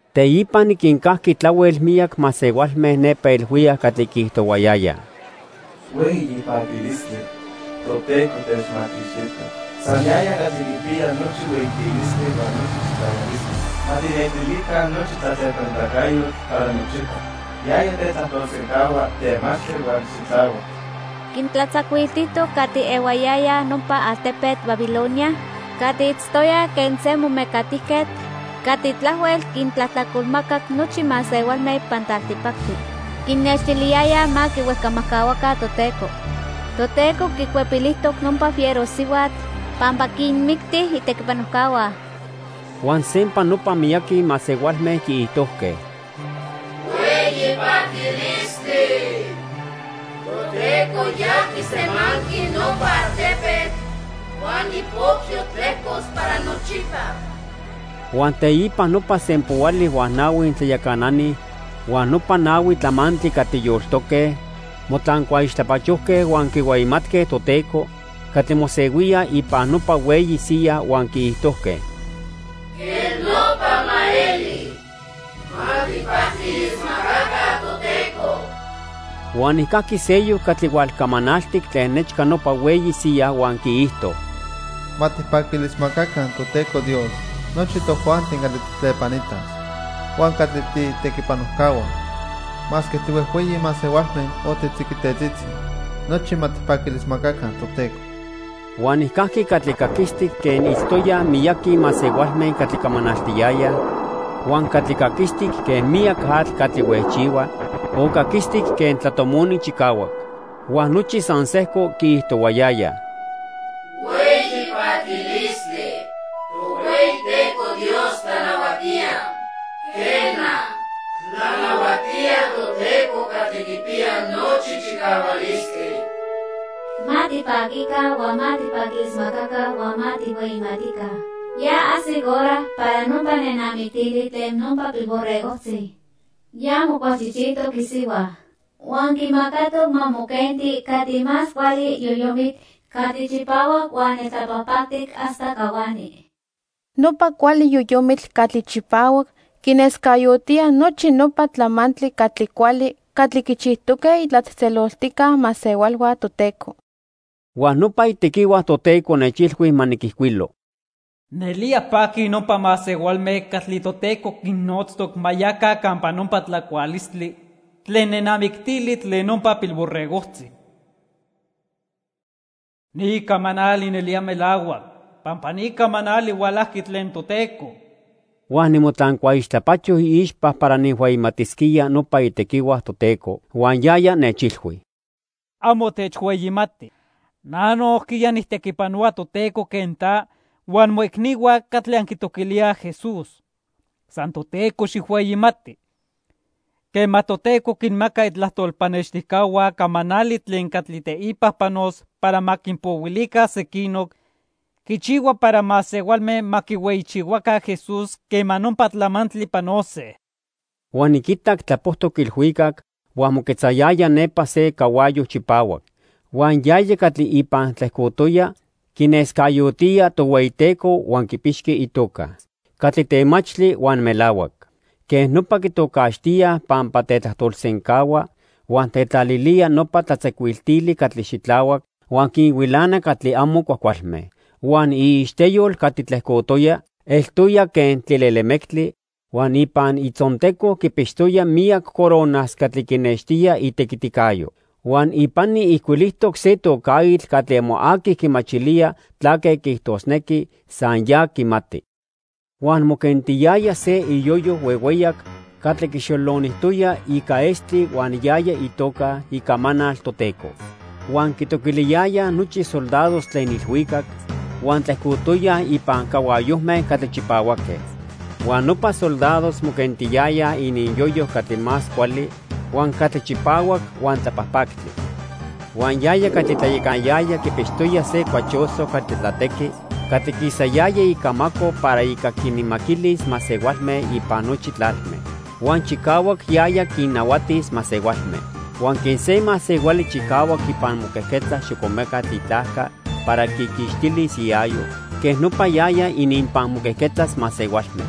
Teipa niquincajqui tlahuel miyac masehualme nepa ilhuicac catli quiijtohuayayaj: "¡Hueyi paquilistli! Toteco techmaquixtijtoc. San yaya catli quipiya nochi hueyitilistli huan nochi chicahualistli. Ma tijnextilica nochi tlatlepanitacayotl para nochipa. Yaya tetlajtolsencahua temachtli huan xitlahuac. Quintlatzacuiltijtoc catli ehuayayaj nopa altepetl Babilonia catli itztoyaj quen se momecatijquetl catli tlahuel quintlajtlacolmacac nochi masehualme ipan tlaltipactli. Quinnextiliyayaj ma quihuejcamajcahuaca Toteco. Toteco quicuepilijtoc nopa fiero sihuatl pampa quinmicti itequipanojcahua." Huan sempa nopa miyaqui masehualme quiijtojque: "¡Hueyi paquilistli! Toteco ya quisemanqui nopa altepetl huan ipocyo tlejcos para nochipa." Huan teipa nopa sempoali huan nahui tlayacanani huan nopa nahui tlamantli catli yoltoque motlancuaixtlapachojque huan quihueyimatque Toteco catli mosehuía ipan nopa hueyi siya huan quiijtojque: "¡Quej nopa ma eli! ¡Ma tijpaquilismacaca Toteco!" Huan nijcajqui seyoc catli hualcamanaltic tlen nechca nopa hueyi siya huan quiijto: "Ma tijpaquilismacaca Toteco Dios nochi tojuanti catli tijtlepanitaj huan catli tiitequipanojcahua. Masque tihuejhueyi masehualme o titziquitetzitzi, nochi ma tijpaquilismacaca Toteco." Huan nijcajqui catli caquistic quen itztoyaj miyaqui masehualme catli camanaltiyayaj, huan catli caquistic quen miyac atl catli huejchihua, o caquistic quen tlatomoni chicahuac. Huan nochi san sejco quiijtohuayayaj: "¡Hueyi paquilistli! Tohueyiteco Dios tlanahuatía, Quena, tlanahuatía Toteco Catli Quipiya Nochi Chicahualistli. Ma tipaquica huan ma tijpaquilismacaca huan ma tijhueyimatica. Ya ajsic hora para nopa nenamictili tlen nopa Pilborregojtzi. Ya mocualchijchijtoc isihua. Huan quimacatoc ma moquenti catli más cuali yoyomitl catli chipahuac huan neltlapajpactic hasta cahuani. Nopa cuali yoyomitl catli chipahuac quinescayotía nochi nopa tlamantli catli cuali catli quichijtoque itlatzejtzeloltijca masehualhua Toteco." Huan nopa itequihua Toteco nechilhui ma niquijcuilo: "Nelía paquij nopa masehualme catli Toteco quinnotztoc ma yaca campa nopa tlacualistli tlen nenamictili tlen nopa Pilborregojtzi." Huan nechilhui: "Ni camanali nelía melahuac pampa ni camanali hualajqui tlen Toteco." Huan nimotlancuaixtlapacho iixpa para nijhueyimatisquía nopa itequihua Toteco. Huan yaya nechilhui: "Amo techhueyimati. Na nojquiya nijtequipanohua Toteco quen ta huan moicnihua catli anquitoquilíaj Jesús. San Toteco xijhueyimati. Quema Toteco quinmaca itlajtol pannextijcahua camanali tlen catli teipa panos para ma quinpohuilica sequinoc, quichihua para masehualme ma quihueyichihuaca Jesús quema nopa tlamantli panose." Huan niquitac tlapojtoc ilhuicac huan moquetzayaya nepa se cahuayo chipahuac. Huan yaya catli ipan tlejcotoya quinescayotía Tohueyiteco huan quipixqui itoca: Catli Temachtli huan Melahuac. Quej nopa quitocaxtíaj pampa tetlajtolsencahua huan tetlalilía nopa tlatzacuiltili catli xitlahuac, huan quinhuilana catli amo cuajcualme. Huan iixteyol catli tlejcotoya eltoya quen tlilelemectli huan ipan itzonteco quipixtoya miyac coronas catli quinextía itequiticayo. Huan ipani ijcuilijtoc se tocaitl catli amo aqui quimachilía tlaque quiijtosnequi, san ya quimati. Huan moquentiyaya se iyoyo huehueyac catli quixolonijtoya ica estli huan yaya itoca: Icamanal Toteco. Huan quitoquiliyayaj nochi soldados tlen ilhuicac huan tlejcotoyaj ipan cahuayojme catli chipahuaque. Huan nopa soldados moquentiyayaj ininyoyo catli más cuali, huan catli chipahuac huan tlapajpactli. Huan yaya catli tlayacanayaya quipixtoya se cuachoso catli tlatequi catli quisayaya icamaco para ica quinmaquilis masehualme ipan nochi tlalme. Huan chicahuac yaya quinnahuatis masehualme. Huan quen se masehuali chicahuac ipan moquejquetza xocomecatl itlajca para quiquixtilis iayo, quej nopa yaya ininpan moquejquetzas masehualme.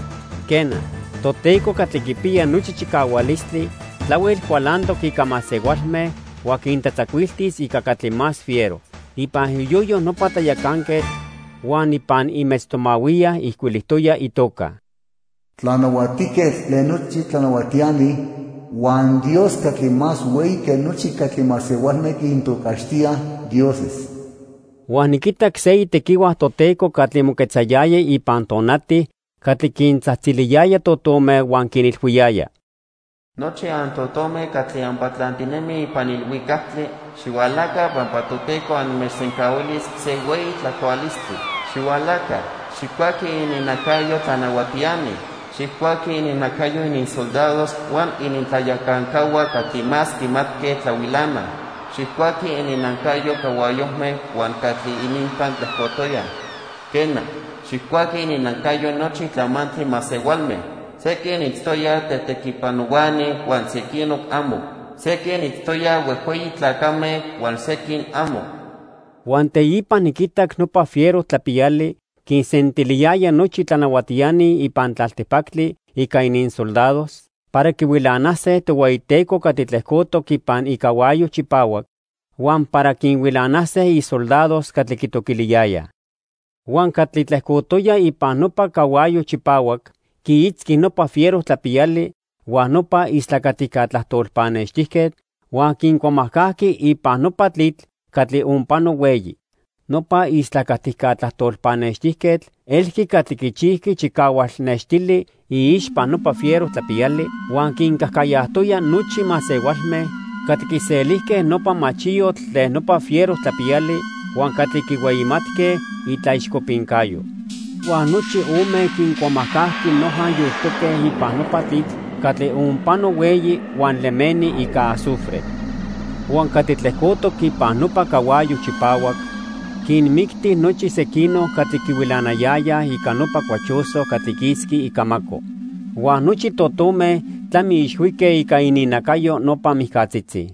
Quena, Toteco Catli Quipiya Nochi Chicahualistli tlahuel cualantoc ica masehualme huan quintlatzacuiltis ica catli más fiero. Ipan iyoyo nopa tlayacanquetl huan ipan imetztomahuiya ijcuilijtoya itoca: Tlanahuatijquetl tlen nochi tlanahuatiani huan Dios catli más hueyi que nochi catli masehualme quintocaxtíaj "dioses". Huan niquitac se itequihua Toteco catli moquetzayaya ipan tonati catli quintzajtziliyaya totome huan quinilhuiyaya: "Nochi antotome catli anpatlantinemij ipan ilhuicactli, xihualaca pampa Toteco anmechsencahuilis se hueyi tlacualistli. Xihualaca, xijcuaquij ininnacayo tlanahuatiani. Xijcuaquij ininnacayo ininsoldados huan inintlayacancahua catli más quimatque tlahuilanaj. Xijcuaquij ininnacayo cahuayojme huan catli ininpan tlejcotoyaj. Quena, xijcuaquij ininnacayo nochi tlamantli masehualme; sequin itztoyaj tetequipanohuani huan sequinoc amo. Sequin itztoyaj huejhueyi tlacame huan sequin amo." Huan teipa niquitac nopa fiero tlapiyali quinsentiliyaya nochi tlanahuatiani ipan tlaltipactli ica ininsoldados para quihuilanase Tohueyiteco catli tlejcotoc ipan icahuayo chipahuac huan para quinhuilanase isoldados catli quitoquiliyayaj. Huan catli tlejcotoya ipan nopa cahuayo chipahuac quiitzqui nopa fiero tlapiyali huan nopa istlacatica tlajtol pannextijquetl, huan quincuamajcajqui ipan nopa tlitl catli onpano hueyi. Nopa istlacatica tlajtol pannextijquetl elqui catli quichijqui chicahual nextili iixpa nopa fiero tlapiyali huan quincajcayajtoya nochi masehualme catli quiselijque nopa machiyotl tlen nopa fiero tlapiyali huan catli quihueyimatque itlaixcopincayo. Huan nochi ome quincuamajcajqui noja yoltoque ipan nopa tlitl catli onpano hueyi huan lemeni ica azufre. Huan catli tlejcotoc ipan nopa cahuayo chipahuac quinmicti nochi sequinoc catli quihuilanayayaj ica nopa cuachoso catli quisqui icamaco. Huan nochi totome tlamiixhuique ica ininnacayo nopa mijcatzitzi.